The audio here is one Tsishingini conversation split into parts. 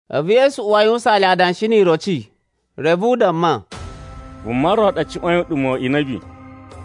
A̱vu Yesu uwa a yuwusaan le adanshi ni iroci. Reve u damma, “Vuma ro ɗa cuwa̱in uɗuma̱ wa̱ inabi,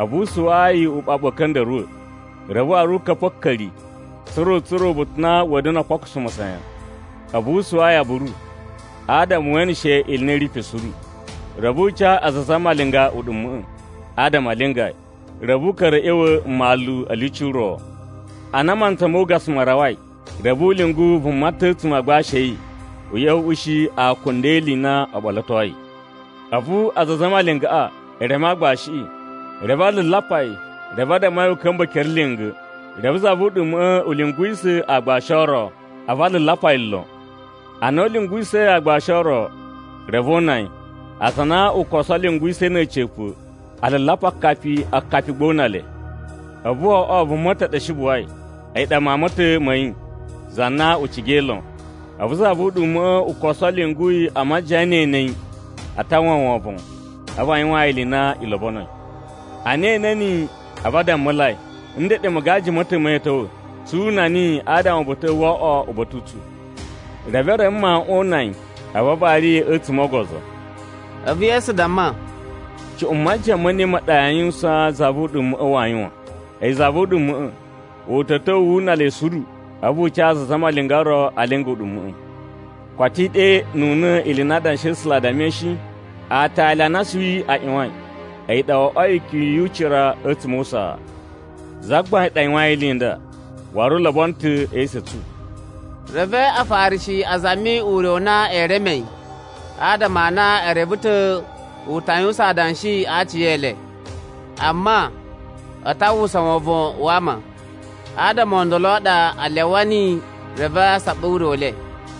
a̱vu u suwaa yi uɓaɓu a̱ka̱nda̱ruwa̱. Reve waru u ka̱pa̱ a̱ka̱ri, tsa̱ra̱ u tsura̱ uba̱ta̱ u na wa̱a̱ da̱na̱ o kpokuso masayan. A̱vu u suwaa yi aburu, adama we eneshe ili i na i ri pe suru. Reve u ca aza a zamalinga uɗuma̱ꞌa̱, adama a linga yi. Reve u ka̱ra̱ a̱ ꞌya̱wa̱ mmalu a̱ lyuci ro. “Ana mantsa mo ugasa ma rawai, reve u lyungu vuma ta̱ a̱tsuma̱ a agbashi a̱ yi u ꞌya̱wa̱ u ushi akunda e ili i na o ɓolotoi. A̱vu aza a zamalingaꞌa e reme aagbashiꞌi, reve a lalapa yi reve a damma yi u ka̱mba̱ ekere lya̱nga̱. Reve za vu uɗuma̱ꞌa̱ u lyunguwisa̱ aagbashi o ro, a̱vu a lalapa yi lon. Ana u lyunguwisa̱i aagbashi o ro, reve o una yi. Aza a na u koso lyunguwisa̱i na̱ a̱ca̱pa̱, a lalapa akapi, akapi gba o una le. “A̱vu wo oꞌwo vuma ta̱ ɗa shi buwai, a̱yi ɗa mawun ma̱ ta̱ ma̱ yi za na u cigai lon. A̱vu za vu uɗuma̱ꞌa̱ u koso lyungu yi a majiyan ne e ene yi, a ta uwwa wovon, a̱vu a yuwaan yi ili i na i lobonoi. “Ana e ene niyi, a̱vu a dammulai, ‘Ndeɗe magaji ma̱ ta̱ ma̱ yi a̱ ta̱wa̱, tsu una niyi adama uba̱ta̱ꞌa̱ wo oꞌwo uba̱ta̱ u tsu.’ Reve e reme mawuꞌun o una yi, a̱vu a vari yi a̱tsuma̱ o ogozo.” A̱vu Yesu damma, “Cuꞌun majiyan ne ɗa yaa yuwusan za vu uɗuma̱ꞌa̱ waa yuwan? A̱yi za vu uɗuma̱ꞌa̱ u ta̱ ta̱wa̱ wu una le suru, a̱vu u ca aza a zamalinga o ro a linga uɗuma̱ꞌa̱. Koto i ɗenuna̱ ili i na Adanshi a̱ A̱sula̱ a dammai shi? ‘Aatali a na asuwi a ꞌyuwain, a̱yi ɗa wo oꞌwoi ikyun yu ucira a̱tsuma̱ o usaa. Zagbain ɗa yuwain ili i nda, waru u lobono ta̱ e esu a̱ tsu.’” Reve Afarishi a zami ure u na ee reme yi adama a na e reve ta̱ u ta yuwusan adanshi a aciyele. Amma a ta uwwusa wovon wa ama, adama o ndolo a ɗa a lyawa niyi. Reve a saɓa ure u le.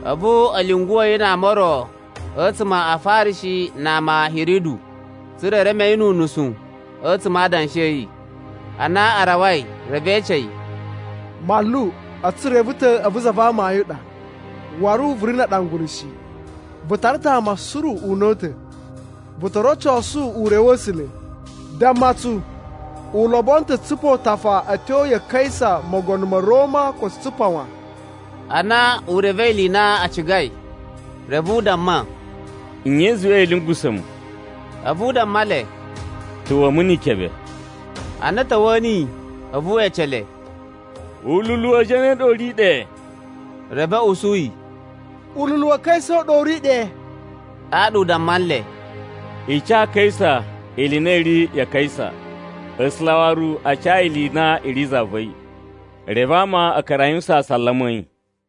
A̱vu a̱ lyunguwa̱ yi ama o ro a̱tsuma̱ a Afarishi na ama a̱ Hiridu, tsa̱ra̱ e reme yi nu unusu a̱tsuma̱ a adanshi a̱ yi. Ana a rawai, reve e ece yi, “Manlu, a̱tsu tsu reve ta̱ a̱vu za va amayun a ɗa, waru vu ri na aɗangulu shi. Vu tara ta̱ ama suru una̱ta̱, vu to rocosu ure wa̱ A̱sula̱. Damma tsu u lobono ta̱ a tsupa utafa a̱ tyo ya Kaisa mogono ma̱ Roma ko tsu tsupa wan?” Ana u revei ili i na a cigai, reve u damma, “Nye i zuwai ya̱a̱ lyungusa̱ mu?” A̱vu u damma le, “Ta̱wa̱a̱ numu ni ikebe.” Ana a̱ ta̱wa̱a̱ niyi, a̱vu we ece le, “Ululu wa zane u ɗa u ri ɗe?” Reve a̱ usu yi, “Ululu wa Kaisa u ɗa u ri ɗe.” Ɗaɗa u damma nle, “I ca Kaisa ili i na i ri ya Kaisa, A̱sula̱ waru a ca yi ili i na i ri za va̱ yi. Reve ama a̱ ka̱ra̱ a yuwusan asalama a̱ yi.”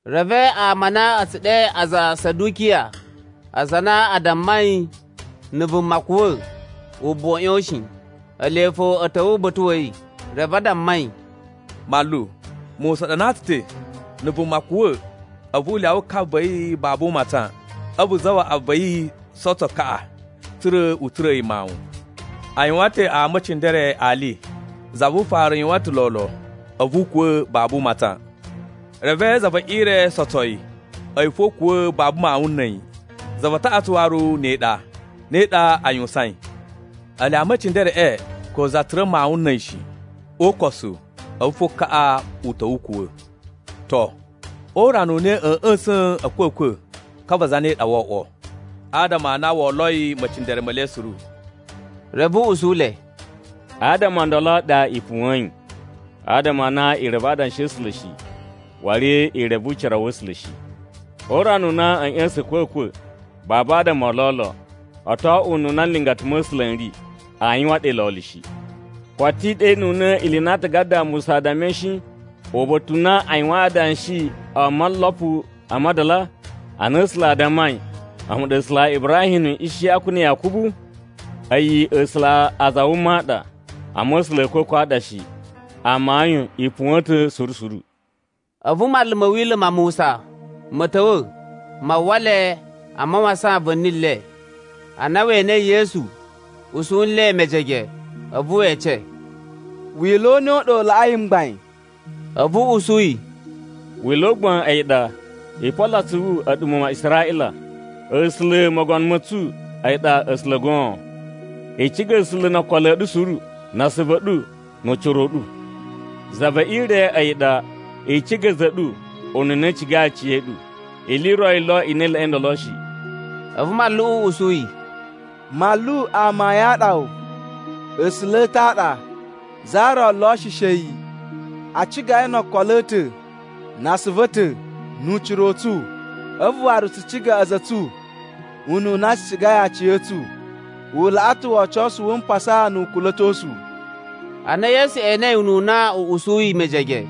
Reve ama a na a̱ tsu ɗe aza a Sadukiya aza a na a dammai na̱ vuma kuwa̱ u buwa a̱ ꞌyon shi, ele fo a̱ ta̱wa̱ uba̱ta̱ wa̱ yi. Reve a damma yi, “Manlu, Musa ɗanaa tsu ta̱, na̱ vuma kuwa̱, a̱vu u lyawa ka va̱ yi babu u matsan, a̱vu zawaꞌa va̱ yi sotso kaꞌa, tsa̱ra̱ u tsura̱a̱ yi mawun. A yuwan ta̱ ama e cindere ali. Za vu ufaru yuwan ta̱ lolo, a̱vu u kuwa̱ babu u matsan. Reve za ve ire sotso yi, a̱yi fo u kuwa̱ babu mawun na̱ a̱yi. Za va taꞌatsu waru ne ɗa, ne ɗa a yuwusain. Ele ama e cindereꞌe ko za tsura̱ mawun na̱ a̱yi shi. O ukosu, a̱vu fo kaꞌa u ta̱wa̱ u kuwa̱. To o urana u na a̱a̱ ꞌya̱sa̱n a̱kwa̱kwa̱, ka va zane ɗa woo oꞌwo, adama a na wo oloi mecindere me le suru?” Reve u usu le, “Adama o ndolo a ɗa i puwa̱in. Adama a na i reve Adanshi a̱ A̱sula̱ shi, waru i reve ucira wa̱ A̱sula̱ shi. O urana u na a̱a̱ ꞌya̱sa̱n a̱kwa̱kwa̱, babu adama o lolo. O to oꞌwo ununa nlingata ma̱ A̱sula̱ n ri, aa yuwan ɗe lolo shi. Koto i ɗenuna̱ ili i na aatagada a Musa a dammai shi, uba̱ta̱ u na u yuwain adanshi o molopu a madala, ana A̱sula̱ a dammai, ‘A̱mu ɗa A̱sula̱ a Ibrahim na̱ Ishiyaku na̱ Yakubu?’ A̱yi A̱sula̱ a aza a wuma a ɗa, amma A̱sula̱ a̱ a̱kwa̱kwa̱ a ɗa shi. Amayun i puwa̱n ta̱ suru suru.” A̱vu manlu ma̱ Wila̱ ma Musa ma̱ ta̱wa̱ ma uwwa le a mawasan va̱ni le. Ana we enei Yesu usu nle mejege, a̱vu we ece, “Wila̱ u ne u ɗa u laꞌai mgbain?” A̱vu u usu yi, “Wila̱ u gbain a̱yi ɗa, ‘I polo atsuvu a̱ɗu muwun ma Israꞌila, A̱sula̱ mogono ma̱ tsu a̱yi ɗa A̱sula̱ goon. I ciga A̱sula̱ no okolo a̱ ɗu suru, na asuvu a̱ ɗu, nu ucira u ɗu.’ Za ve ire a̱yi ɗa, ‘I ciga a̱za̱ a̱ ɗu ununa i cigai aciya̱ɗu.’ Ili i ro yi lo i laꞌai ndolo shi.” A̱vu manluꞌu u usu yi, “Manlu amayun a ɗa wu, A̱sula̱ a̱ ta̱ a ɗa, za ro lo shi she a̱yi. A ciga yi no okolo a̱ ta̱, na asuvu a̱ ta̱, nu ucira u tsu, a̱vu waru tsu ciga a̱za̱ a̱ tsu ununa tsu cigai aciya̱tsu. U laꞌa ta̱ wocosu wu mpasa nu ukula̱tosu.” Ana Yesu enei ununa u usuyi mejege,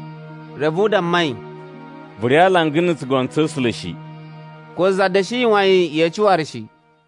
reve u damma yi, “Vu ri alanga na̱ tsugono tsa̱ A̱sula̱ shi.” Ko za da̱shi yuwan yi yeci waru shi.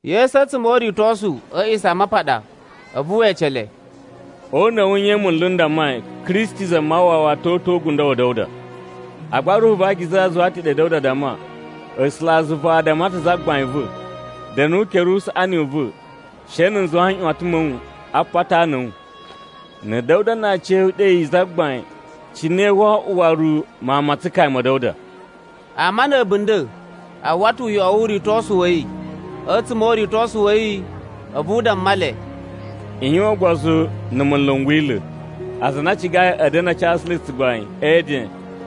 Yesu a̱tsuma̱ o uritosu a̱ A̱a̱ꞌisamapaɗa, a̱vu we ece le, “O una̱ wu nye munlu n dammai Kristi Zamawawa to uta̱ o ugundo wa̱ Da̱wuda? Agba Ruhu va Akiza zuwa ta̱ ɗe Da̱wuda damma: ‘A̱sulazuva a damma ta̱ Zagbain va̱: “Da̱nu o ukere usaꞌani u va̱, she na̱ n zuwa nꞌyuwatan ma̱ wu a apata a ana a̱ wu.” ’ “Na̱ Da̱wuda na aciya̱yi u ɗe yi ‘Zagbain’, cine woo oꞌwo waru mawun ma tsukaya ma̱ Da̱wuda?” Ama na̱ a̱bunda̱ a uwwa ta̱ uyoꞌo wu uritosu wa̱ yi. A̱tsuma̱ o uritosu wa̱ yi, a̱vu u damma le, “I yuwan ugbozu na̱ munlu n Wila̱. Aza a na a cigai a̱ da̱na̱ a casu le tsugbain e eden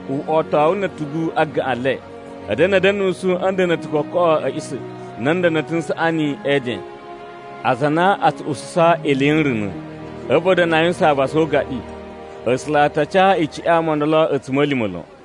uꞌwotowu na̱ a̱tugu a gaꞌan le, a̱ da̱na̱ a̱ da̱nusu a̱ nda̱na̱ta̱ koꞌo a̱ a̱ꞌisa̱, na̱ nda̱na̱ta̱ n saꞌani e eden. Aza a na a tsu ususa ili yi nruna̱. A̱vu a̱ da̱na̱ a yuwusan avasa o ugaɗi. A̱sula̱ a ta ca icuꞌun ya ama o ndolo a̱tsuma̱lima̱ lon.”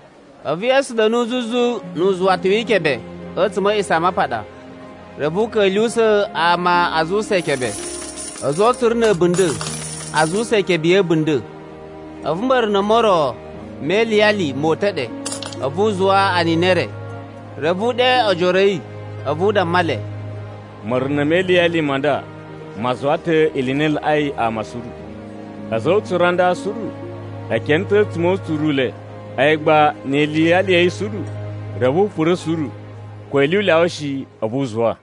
A̱vu Yesu da̱nu zuzu nu uzuwata wi ikebe a̱tsuma̱ a̱ A̱a̱ꞌisamapaɗa. Reve u ka̱lyuwusa̱ ama a zuwusa ikebe. A̱za̱ o utsuru na̱ a̱bunda̱ a zuwusa ikebe ya̱ a̱bunda̱. A̱vu ma̱runa̱ mo ro me iliyali mo uta̱ ɗe, a̱vu u zuwa anini e re. Reve u ɗe ojoro a̱ yi, a̱vu u damma le, “Ma̱runa̱ me iliyali ma nda ma zuwa ta̱ ili i na i laꞌai ama suru. A̱za̱ o utsuru a nda suru e kene ta̱ a̱tsuma̱ o utsuru u le. A̱yi gba ni iliyali ya̱ yi suru, reve u pura̱ suru ko ili u lyawa shi a̱vu u zuwa.”